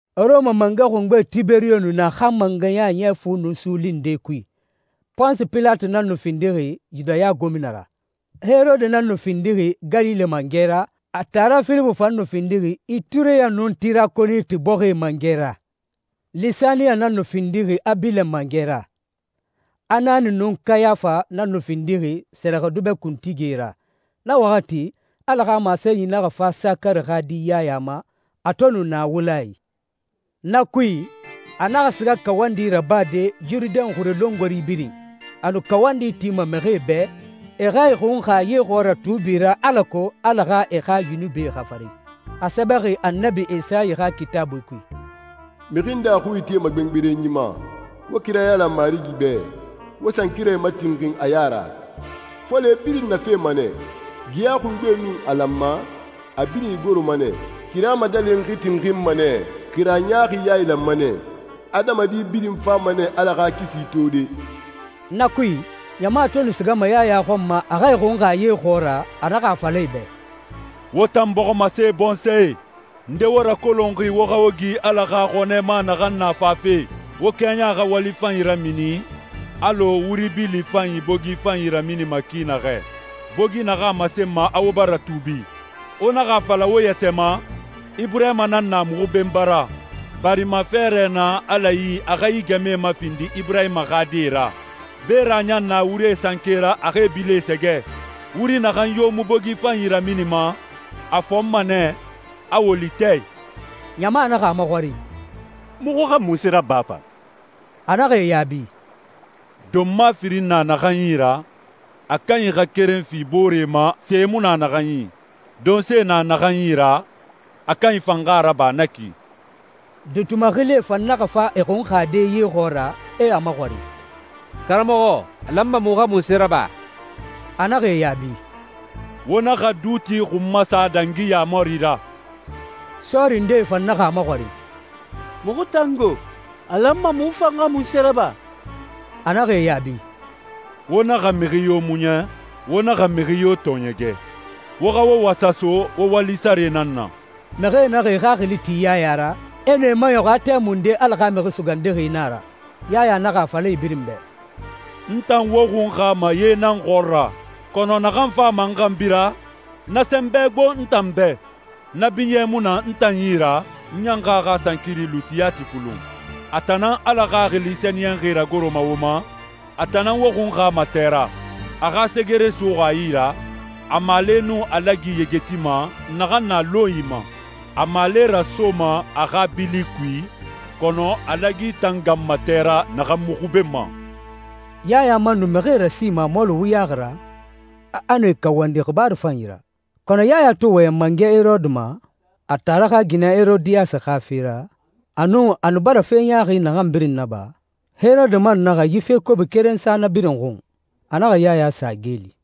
Rɔma mangɛ xungbe Tiberiyo nu na a xa mangɛya ɲɛ fu nun suuli nde kui. Ponsi Pilati nan nu findixi Yudaya gomina ra. Herode nan nu findixi Galile mangɛ ra, a taara Filipu fan nu findixi Itureya nun Tirakoniti bɔxie mangɛ ra. Lisaniya nan nu findixi Abilen mangɛ ra. Anani nun Kayafa nan nu findixi sɛrɛxɛdubɛ kuntigie ra. Na waxati, Ala xa masenyi naxa fa Sakari xa di Yaya ma, a to nu na wula i. Na kui, a naxa siga kawandi rabade Yurudɛn xure longori birin. A nu kawandi tima mixie bɛ, e xa e xunxa ye xɔɔra tuubi ra, alako Ala xa e xa yunubie xafari. A sɛbɛxi Annabi Esayi xa Kitaabui kui, «Mixi nde a xui itema gbengberenyi ma, ‹Wo kira yailan Marigi bɛ, wo sankirae matinxin a ya ra. Fole birin nafema nɛ. Geya xungbe nun a lanma, a birin igoroma nɛ. Kira madalinxi tinxinma nɛ, kira ɲaaxi yailanma nɛ. Adamadi birin fama nɛ Ala xa kisi tode.›» Na kui, ɲama to nu sigama Yaya xɔn ma a xa e xunxa ye xɔɔra, a naxa a fala e bɛ, «Wo tan bɔximase bɔnsɔɛ! Nde wo rakolonxi wo xa wo gi Ala xa xɔnɛ ma naxan na fafe? Wo kɛɲa xa wali fanyi ramini alɔ wuri bili fanyi bogi fanyi raminima ki naxɛ, bogi naxan a masenma a wo bara tuubi. Wo naxa a fala wo yɛtɛ ma, ‹Iburahima nan na muxu benba ra,› barima fɛɛrɛ na Ala yi a xa yi gɛmɛe mafindi Iburahima xa die ra. Beera ɲan na wurie sankee ra a xa e bilie sɛgɛ. Wuri naxan yo mu bogi fanyi raminima, a fɔnma nɛ, a woli tɛ i.» Ɲama naxa a maxɔrin, «Muxu xa munse raba fa?» A naxa e yaabi, «Donma firin na naxan yi ra, a kanyi xa keren fi boore ma, se mu na naxan yi. Donse na naxan yi ra, a kanyi fan xa a raba na ki.» Duuti maxilie fan naxa fa e xunxade ye xɔɔra, e a maxɔrin, «Karamɔxɔ, a lanma muxu xa munse raba?» A naxa e yaabi, «Wo naxa duuti xun masa dangi yaamari ra.» Sɔɔri ndee fan naxa a maxɔrin, «Muxu tan go? A lanma muxu fan xa munse raba?» A naxa e yaabi, «Wo naxa mixi yo muɲa, wo naxa mixi yo tɔɔɲɛgɛ. Wo xa wo wasa so wo wali sare nan na.» Mixie naxa e xaxili ti Yaya ra, e nu e maɲɔxun, a tɛmunde Ala xa Mixi Sugandixi na a ra. Yaya naxa a fala e birin bɛ, «N tan wo xunxama ye nan xɔɔra, kɔnɔ naxan fama n xanbi ra, na sɛnbɛ gbo n tan bɛ. Na binyɛ mu na n tan yi ra, n ɲan xa a xa sankiri luuti yati fulun. A tan nan Ala Xaxili Sɛniyɛnxi ragoroma wo ma, a tan nan wo xunxama tɛ ra. A xa segere suxuxi a yi ra, a maale nun a lagi yegetima naxan na lɔnyi ma. A maale rasoma a xa bili kui, kɔnɔ a lagi tan ganma tɛ ra naxan mu xubenma.» Yaya man nu mixie rasima a mɔɔli wuyaxi ra, a nu e kawandi xibaaru fanyi ra. Kɔnɔ Yaya to wɔyɛn mangɛ Herode ma, a taara xa ginɛ Herodiyasi xa fe ra, a nun a nu bara fe ɲaaxi naxan birin naba, Herode man naxa yi fe kobi keren sa na birin xun: A naxa Yaya sa geeli.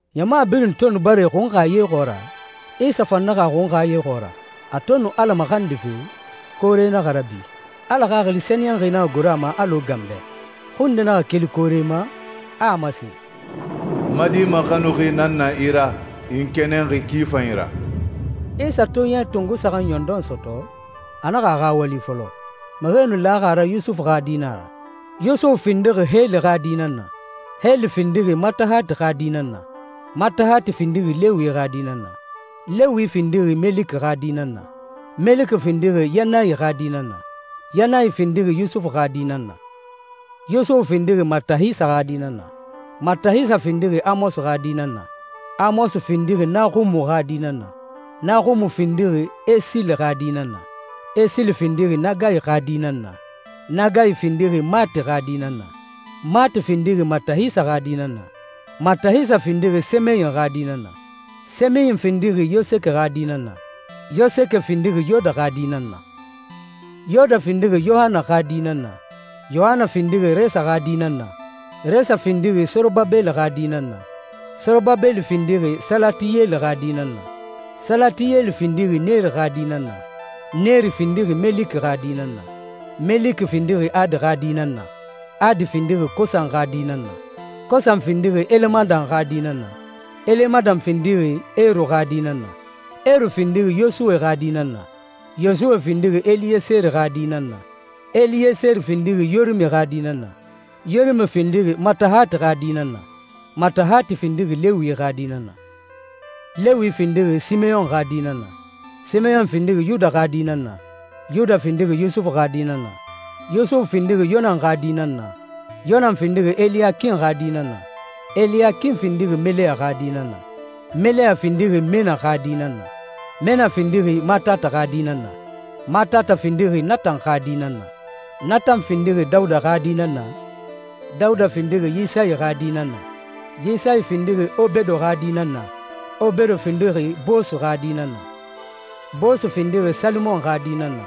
Ɲama birin to nu bara e xunxa ye xɔɔra, Isa fan naxa a xunxa ye xɔɔra. A to nu Ala maxandife, koore naxa rabi, Ala Xaxili Sɛniyɛnxi naxa goro a ma alɔ ganbɛ. Xui nde naxa keli koore ma, a a masen, «N ma Di maxanuxi nan na i ra. I n kɛnɛnxi ki fanyi ra.» Isa to ɲɛ tongo saxan ɲɔndɔn sɔtɔ, a naxa a xa wali fɔlɔ. Mixie nu laxi a ra Yusufu xa di nan a ra. Yusufu findixi Heli xa di nan na, Heli findixi Matahati xa di nan na, Matahati findixi Lewi xa di nan na, Lewi findixi Meliki xa di nan na, Meliki findixi Yannayi xa di nan na, Yannayi findixi Yusufu xa di nan na, Yusufu findixi Matahisa xa di nan na, Matahisa findixi Amosi xa di nan na, Amosi findixi Naxumu xa di nan na, Naxumu findixi Esili xa di nan na, Esili findixi Nagayi xa di nan na, Nagayi findixi Maati xa di nan na, Maati findixi Matahisa xa di nan na, Matahisa findixi Semeyin xa di nan na, Semeyin findixi Yoseke xa di nan na, Yoseke findixi Yoda xa di nan na, Yoda findixi Yohana xa di nan na, Yohana findixi Resa xa di nan na, Resa findixi Sorobabeli xa di nan na, Sorobabeli findixi Salatiyeli xa di nan na, Salatiyeli findixi Neri xa di nan na, Neri findixi Meliki xa di nan na, Meliki findixi Adi xa di nan na, Adi findixi Kosan xa di nan na, Kosan findixi Elemadan xa di nan na, Elemadan findixi Eru xa di nan na, Eru findixi Yosuwe xa di nan na, Yosuwe findixi Eliyeseri xa di nan na, Eliyeseri findixi Yorimi xa di nan na, Yorimi findixi Matahati xa di nan na, Matahati findixi Lewi xa di nan na, Lewi findixi Simeyɔn xa di nan na, Simeyɔn findixi Yuda xa di nan na, Yuda findixi Yusufu xa di nan na, Yusufu findixi Yonan xa di nan na, Yonan findixi Eliyakin xa di nan na, Eliyakin findixi Meleya xa di nan na, Meleya findixi Mena xa di nan na, Mena findixi Matata xa di nan na, Matata findixi Natan xa di nan na, Natan findixi Dawuda xa di nan na, Dawuda findixi Yisayi xa di nan na, Yisayi findixi Obedo xa di nan na, Obedo findixi Boosu xa di nan na, Boosu findixi Salimon xa di nan na,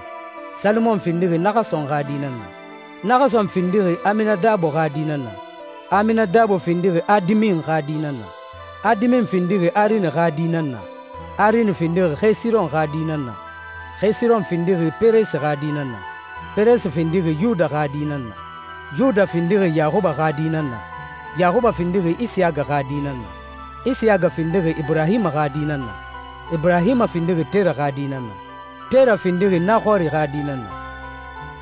Salimon findixi Naxason xa di nan na, Naxason findixi Aminadabo xa di nan na, Aminadabo findixi Adimin xa di nan na, Adimin findixi Arini xa di nan na, Arini findixi Xesiron xa di nan na, Xesiron findixi Peresi xa di nan na, Peresi findixi Yuda xa di nan na, Yuda findixi Yaxuba xa di nan na, Yaxuba findixi Isiyaga xa di nan na, Isiyaga findixi Iburahima xa di nan na, Iburahima findixi Tera xa di nan na, Tera findixi Naxori xa di nan na,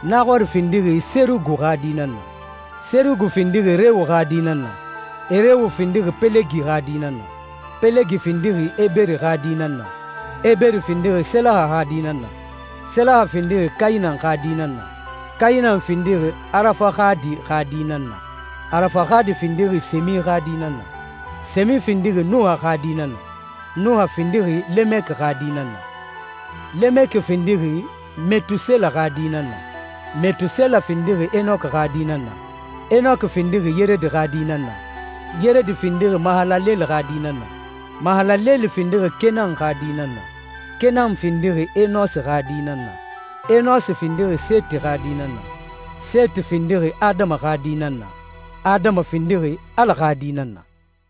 Naxori findixi Serugu xa di nan na, Serugu findixi Rewu xa di nan na, Rewu findixi Pelegi xa di nan na, Pelegi findixi Eberi xa di nan na, Eberi findixi Selaha xa di nan na, Selaha findixi Kayinan xa di nan na, Kayinan findixi Arafaxadi xa di nan na, Arafaxadi findixi Semi xa di nan na, Semi findixi Nuha xa di nan na, Nuha findixi Lemeki xa di nan na, Lemeki findixi Metusela xa di nan na, Metusela findixi Enoki xa di nan na, Enoki findixi Yeredi xa di nan na, Yeredi findixi Mahalaleli xa di nan na, Mahalaleli findixi Kenan xa di nan na, Kenan findixi Enosi xa di nan na, Enosi findixi Seti xa di nan na, Seti findixi Adama xa di nan na, Adama findixi Ala xa di nan na.